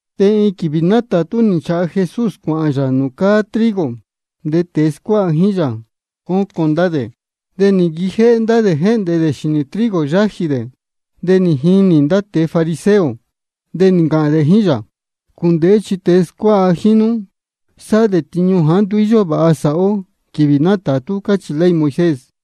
De iin quīvī nátātú nī nchāha Jesús cuāhān yā nūū cáá trigo. De tēe scuáha jíín yā, cócon ndá dē. De nī nquijéhé ndá dē jéhndē dē xīnī trigo yájī dē. De nī jinī ndá tēe fariseo, de nī ncāhān dē jíín yā: Cūndēhé chi ndá tēe scuáha jíín nú sáhá dē tiñu jāá nduú vāha jā sāhá ó quīvī nátātú, cáchī ley Moisés.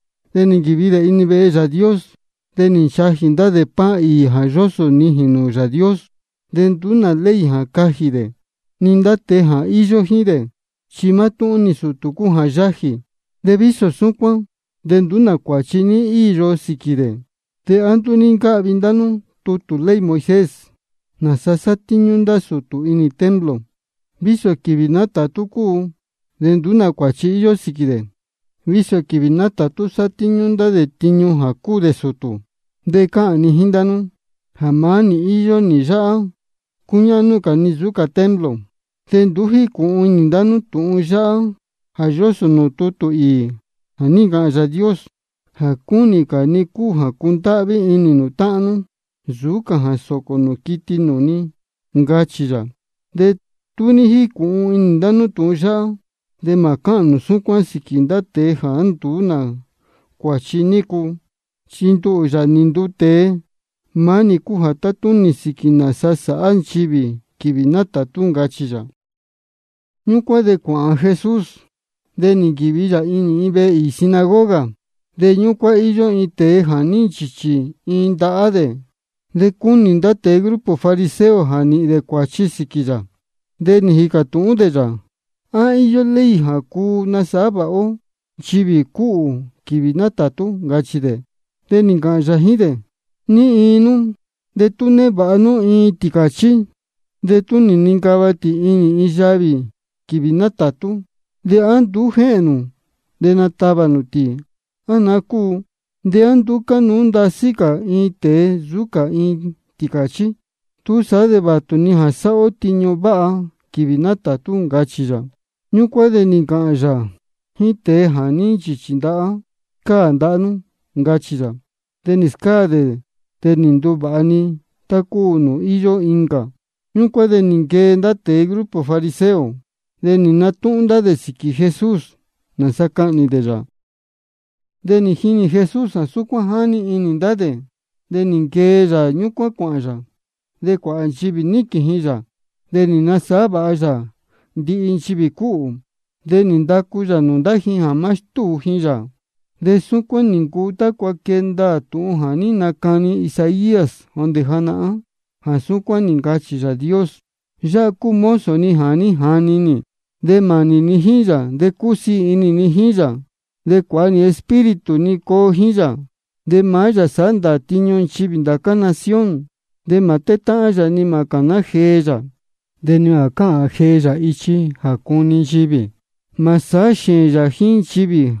De nī nquīvi dē inī vehe Yāā Dios. De nī nchajī dē pan īī jā yósō nijīn nūū Yāā Dios. De nduú nā ley jā cajī dē, ni ndá tēe íyó jíín dē, chi maá-ni sūtū cúu jā yájī. De vísō súcuán de nduú nā cuāchi ní íyo sīquī dē. ¿De á nduú ní ncáhvi ndá nú tutū ley Moisés, nāsa sátíñú ndá sūtū inī templo, vísō quīvī nátātú cúu? De nduú nā cuāchi íyó sīquī dē, vísō quīvī nátātú sátíñú ndá dē tiñu jā cúu dē sūtū. De cáhān ni jíín ndá nú jā maá nī jā íyó nī yáhá, cúñáhnú cā ni nsūú cā templo. De nduú jícūhun inī ndá nú tūhun yáhá jā yósō nūū tutū īī jā ní ncāhān Yāā Dios: Jā cúnī cā ni cúu jā cundáhví inī nū táhán nú, nsūú cā jā sōcō nū quiti nūū ni, ncachī yā. De tú ní jícūhun inī ndá nú tūhun yáhá, de mā cáhān nū súcuán sīquī ndá tēe jāá nduú nā cuāchi nícu. Chi nduhū, Yāā nī nduu tēe, maá nī cúu jā tátúnī sīquī nāsa sāhá nchivī quīvī nátātú, ncachī yā. Ñúcuán de cuāhān Jesús, de nī nquīvi yā inī vehe īī sinagoga. De ñúcuán íyó iin tēe jā ní nchīchī iin ndahá dē. De cúnī ndá tēe grupo fariseo jā nīhīn dē cuāchi sīquī yā, de nī jīcā tūhún dē yā: ¿A íyó ley jā cuu nasāhá vāha ó nchivī cúhū quīvī nátātú? ncachī dē. De nī ncāhān yā jíín dē: ¿Ní iin nú, de tú névāha nú iin tīcāchí, de tú nincava tī iin yavī quīvī nátātú, de á nduú jéhēn nū natavā nū tī, á naá cúu? ¿De á nduú cánuú ndasí cā iin tēe nsūú cā iin tīcāchí? Túsaá de vātu-ni jā sāhá ó tiñu váha quīvī nátātú, ncachī yā. Ñúcuán de nī ncāhān yā jíín tēe jā ní nchīchī ndahá: Scáā ndahá nú, ncachī yā. De nī scáā dē, de nī nduvāha-ni tá cúu nūū íyó incā. Ñúcuán de nī nquee ndá tēe grupo fariseo, de nī natúhún ndá dē sīquī Jesús, nāsa cahnī dē yā. De nī jinī Jesús jā súcuán jáni inī ndá dē, de nī nquee yā ñúcuán cuāhān yā. De cuāhā nchivī níquīn ji yā. De nī nasāhá vāha yā ndihi nchivī cúhū. De nī ndacu yā nūū ndá ji jā má stúu ji yā. De súcuán nī ncuu tácua quee ndaā tūhun jā ní nacani Isaías jondē janahán, jā súcuán nī ncāhān Yāā Dios: Yáhá cúu mozo ni jā ní jani nī, de mānī ni jíín yā, de cúsiī inī ni jíín yā. De cuāha nī Espíritu ni coo jíín yā. De maá yā sāhá ndāā tiñu nchivī ndācá nación. Mā tétáhán yā, ni mā cāná jee yā, de ni mā cáhān jee yā ichi jā cuni nchivī. Mā sāhá xēēn yā jíín nchivī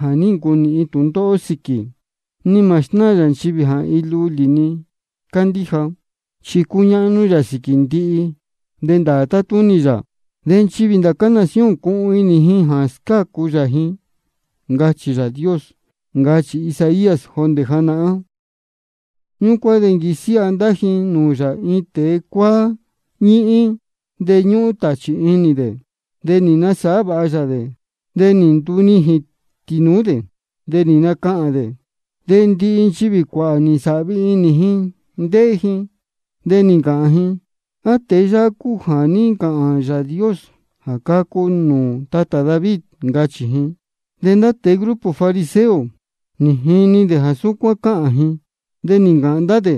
jā ní ncunīhin tūndóhó sīquī, ni mā snáā yā nchivī jā iin lulī-ni cándíja. Chi cuñáhnú yā sīquī ndihi, de ndāā tatúnī yā. De nchivī ndācá nación cuhun inī ji jā scácu yā ji. Ncachī Yāā Dios, ncachī Isaías jondē janahán. Ñúcuán de nī nquisiáha ndá ji nūū yā iin tēe cuáá ñíhín, chi ñúhún tāchī inī dē. De nī nasāhá vāha yā dē. De nī ndunijīn tīnūú dē, de nī nacahān dē. De ndihi nchivī cuāhā nī nsāhvi inī ji ndéhé ji, de nī ncāhān ji: ¿A tēe yáhá cúu jā ní ncāhān Yāā Dios jā cacu nūū tatā David? ncachī ji. De ndá tēe grupo fariseo, nī jini dē jā súcuán cáhān ji. De nī ncāhān ndá dē: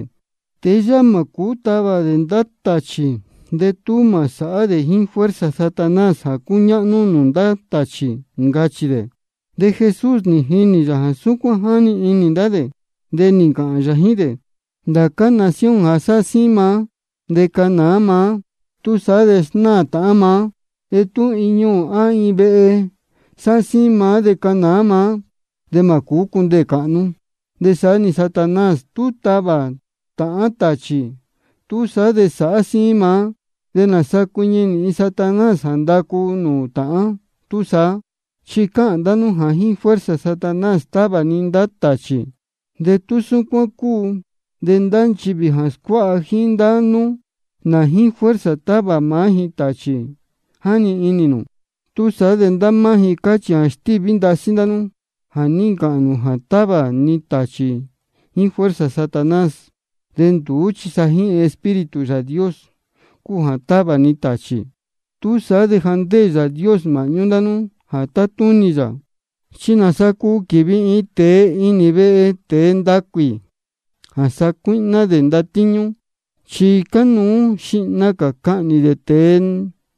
Tēe yáhá mā cūú tavā dē ndá tāchī de tú mā sāhá dē jíín fuerza Satanás jā cúñáhnú nūū ndá tāchī, ncachī dē. De Jesús nī jinī yā jā súcuán jáni inī ndá dē, de nī ncāhān yā jíín dē: Ndācá nación jā sáhá síín maá de cánāá maá, túsaá de snáā tāhán maá. De tú iin ñuū á iin vehe sáhá síín maá de cánāá maá, de mā cūú cā cundeē cāhnú. De saá-ni Satanás tú tavā táhán tāchī, túsaá de sáhá síín maá. ¿De nāsa cuiñi nīhin Satanás jā ndacu nūū táhán túsaá? Chi cáhān ndá nú jā jíín fuerza Satanás távā ni ndá tāchī. De tú súcuán cúu de ndá nchivī jā scuáha jíín ndá nú, ¿nā jīín fuerza távā maá ji tāchī, jáni inī nū? Túsaá de ndá máá ji cachī jā ní stíví ndasí nú jā ní ncāhān nū jā távā ni tāchī jíín fuerza Satanás. De nduú chi sa jíín Espíritu Yāā Dios cúu jā távā ni tāchī. Túsaá de ja ndéē Yāā Dios māhñú ndá nú jā tátúnī yā. ¿Chi nāsa cuu quīvi iin tēe inī vehe tēe ndacuī jā sacuíhná dē ndatíñú? Chi cánuú jā xihna cā cuhnī dē tēe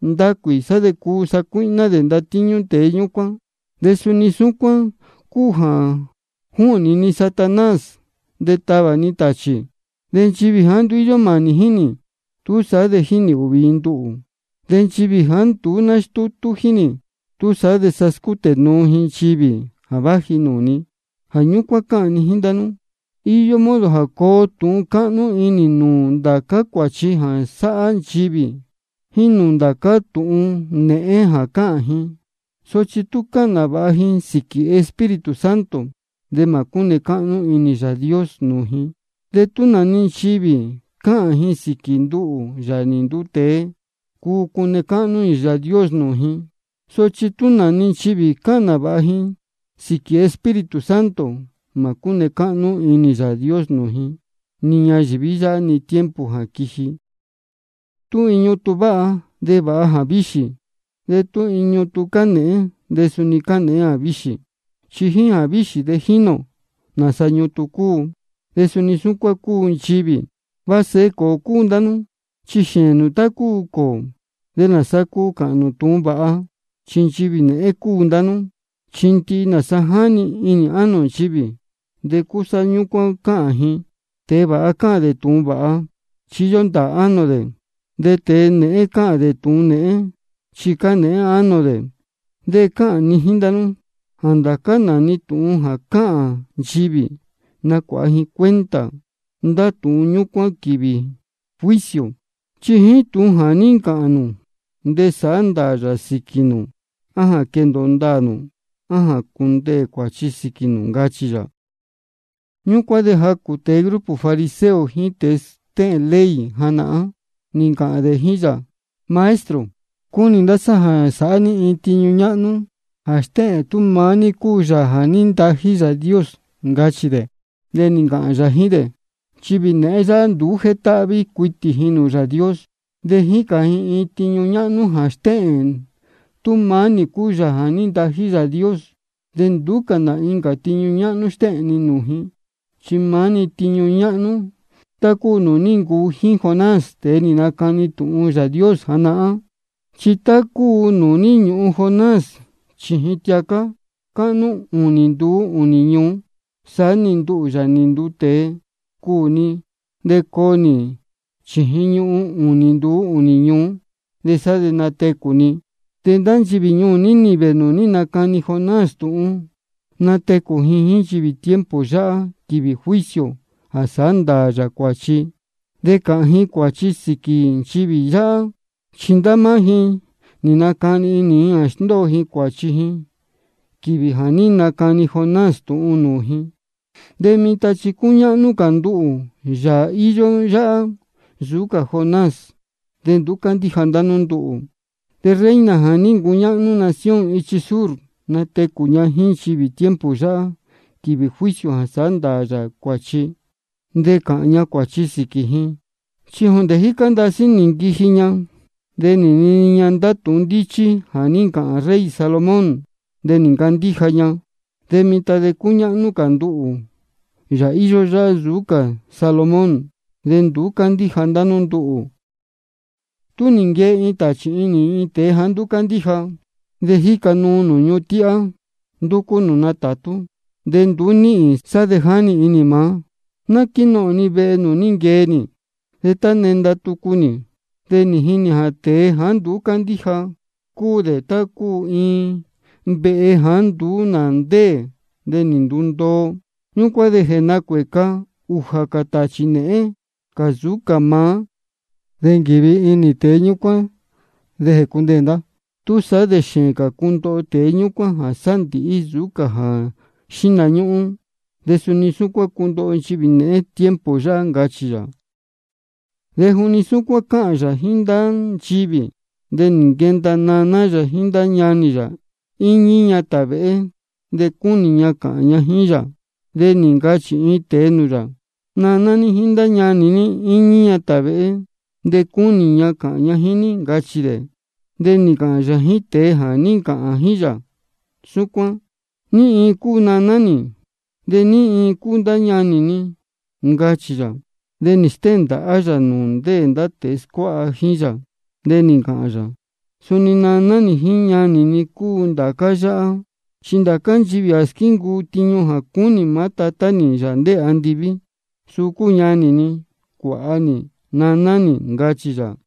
ndacuī, sá de cuu sacuíhná dē ndatíñú tēe ñúcuán. De suni súcuán cúu jā júhnī ni Satanás de távā ni tāchī. De nchivī jāá nduú íyó mānī jíín nī, túsaá de jínī ūhvī ji nduhū. De nchivī jāá nduú nástútú jíín nī, túsaá de sa scútē nuu ji nchivī jā váji nūū ni. Jā ñúcuán cáhān ni jíín ndá nú: Iyó modo jā coo tūhun cáhnú inī nūū ndācá cuāchi jā sáhá nchivī, jíín nūū ndācá tūhun nēhén jā cáhān ji. Sochi tú cāhān nāvāha ji sīquī Espíritu Santo, de mā cúne cáhnú inī Yāā Dios nūū ji. De tú nā-ni nchivī cāhān ji sīquī nduhū, Yāā nī nduu tēe, cuu cune cáhnú inī Yāā Dios nūū ji. Sochi tú nā-ni nchivī cāhān nāvāha ji sīquī Espíritu Santo, mā cúne cáhnú inī Yāā Dios nūū ji, ni ñayīví yáhá, ni tiempo jā quiji. Tú iin ñutun váha, de vāha jāvíxī, de tú iin ñutun cánēhén, de suni cánēhén jāvíxī. Chi jíín jāvíxī de jínī ō nāsa ñutun cúu. De suni súcuán cúu nchivī. Va sēhe cōō cúu ndá nú, chi xēēn nū tá cúu cōō. ¿Nāsa cuu cāhān nū tūhun vāha, chi nchivī nēhén cúu ndá nú? Chi ndihi nāsa jáni inī ánō nchivī, de cúsá ñúcuán cáhān ji. Tēe vāha cáhān dē tūhun vāha, chi íyó ndāā ánō dē. De tēe nēhén cáhān dē tūhun nēhén, chi cánēhén ánō dē. De cáhān ni jíín ndá nú jā ndācá nā-ni tūhun jā cáhān nchivī, nacuāha ji cuenta ndá tūhun ñúcuán quīvī quiji juicio. Chi jíín tūhun jā ní ncāhān nū de sāhá ndāā yā sīquī nū, á jā quendōo ndāā nū á jā cundeē cuāchi sīquī nū, ncachī yā. Ñúcuán de jacū tēe grupo fariseo jíín tēe stéhēn ley janahán, nī ncāhān dē jíín yā: Maestro, cúnī ndá sá jā sāhá ní iin tiñu ñáhnú jā stéhēn tú maá ní cúu Yāā jā ní ntají Yāā Dios, ncachī dē. De nī ncāhān yā jíín dē: Nchivī nēhén yáhá nduú jétáhví cuitī ji Yāā Dios. De jícān ji iin tiñu ñáhnú jā stéhēn tú maá nī cúu Yāā jā ní ntají Yāā Dios. De nduú cā nā incā tiñu ñáhnú stéhēn ni nūū ji, chi maá-ni tiñu ñáhnú tá cúu nūū ní ncuu jíín Jonás, tēe nī nacani tūhun Yāā Dios janahán. Chi tá cúu nūū ní ñūhun Jonás chījin tiacá cáhnú ūnī nduú ūnī ñuú, de saá-ni nduhū, Yāā nī nduu tēe, cuū ni de coo nī chījin ñuhun ūnī nduú ūnī ñuú, de sá de natecū ni. De ndá nchivī ñuū Nínive nūū ní nacani Jonás tūhun, natecū ji jíín nchivī tiempo yáhá, quīvī juicio jā sāhá ndāā yā cuāchi, de cāhān ji cuāchi sīquī nchivī yáhá. Chi ndá máá ji nī nacani inī ji nī sndóo ji cuāchi ji quīvī jā ní nacani Jonás tūhun nūū ji. De mitan chi cúñáhnú cā nduhū, Yāā íyó yáhá, nsūú cā Jonás, de nduú cándíja ndá nú nduhū. De reina jā ní ncuñáhnú nación ichi sur, natecū ña jíín nchivī tiempo yáhá, quīvī juicio jā sāhá ndāā yā cuāchi, de cāhān ña cuāchi sīquī ji. Chi jondē jícá ndasí nī nquiji ña nī nini ña ndá tūhun ndíchí jā ní ncāhān rey Salomón, de nī ncandíja ña. De mitan chi cúñáhnú cā nduhū, Yāā íyó yáhá, nsūú cā Salomón, de nduú cándíja ndá nú nduhū. Tú nī nquee iin tāchī inī iin tēe jāá nduú cándíja, de jíca nuu nūū ñuhun tíhá, ndúcú nūū natātú, de nduú níhīn, sá de jáni inī maá: Ná quínohōn ni vehe nūū ní nquee nī. De tá nī nenda tucu, de jínī jā tēe jāá nduú cándíja, cúu dē tá cúu iin vehe jāá nduú nā ndéē de nī ndundoo. Ñúcuán de jéhēn jénacuēca ūjā cā tāchī nēhén cā nsūú cā maá. De quívi ndá inī tēe ñúcuán de jécundeē ndá. Túsaá de xēēn cā cundoho tēe ñúcuán jā sándīhí nsūú cā jā xíhna ñúhún. De suni súcuán cundoho nchivī nēhén tiempo yáhá, ncachī yā. De juni súcuán cáhān yā jíín ndá nchivī, de nī nquenda naná yā jíín ndá ñanī yā, íñí ña tāvēhé, de cúnī ña cāhān ña jíín yā. De nī ncachī iin tēe nūū yā: Naná ní jíín ndá ñanī ní íñí ña tāvēhé, de cúnī ña cāhān ña jíín ní, ncachī dē. De nī ncāhān yā jíín tēe jā ní ncāhān jíín yā súcuán: ¿Ní iin cúu naná nī, de ní iin cúu ndá ñanī ni? ncachī yā. De nī stéhēn ndāhá yā nūū ndéē ndá tēe scuáha jíín yā. De nī ncāhān yā: Suni naná nī jíín ñanī ni cúu ndācá yáhá. Chi ndācá nchivī jā squíncuu tiñu jā cúnī maá Tatá nī, Yāā ndéē andiví, suu cúu ñanī ni, cuāha nī, naná nī, ncachī yā.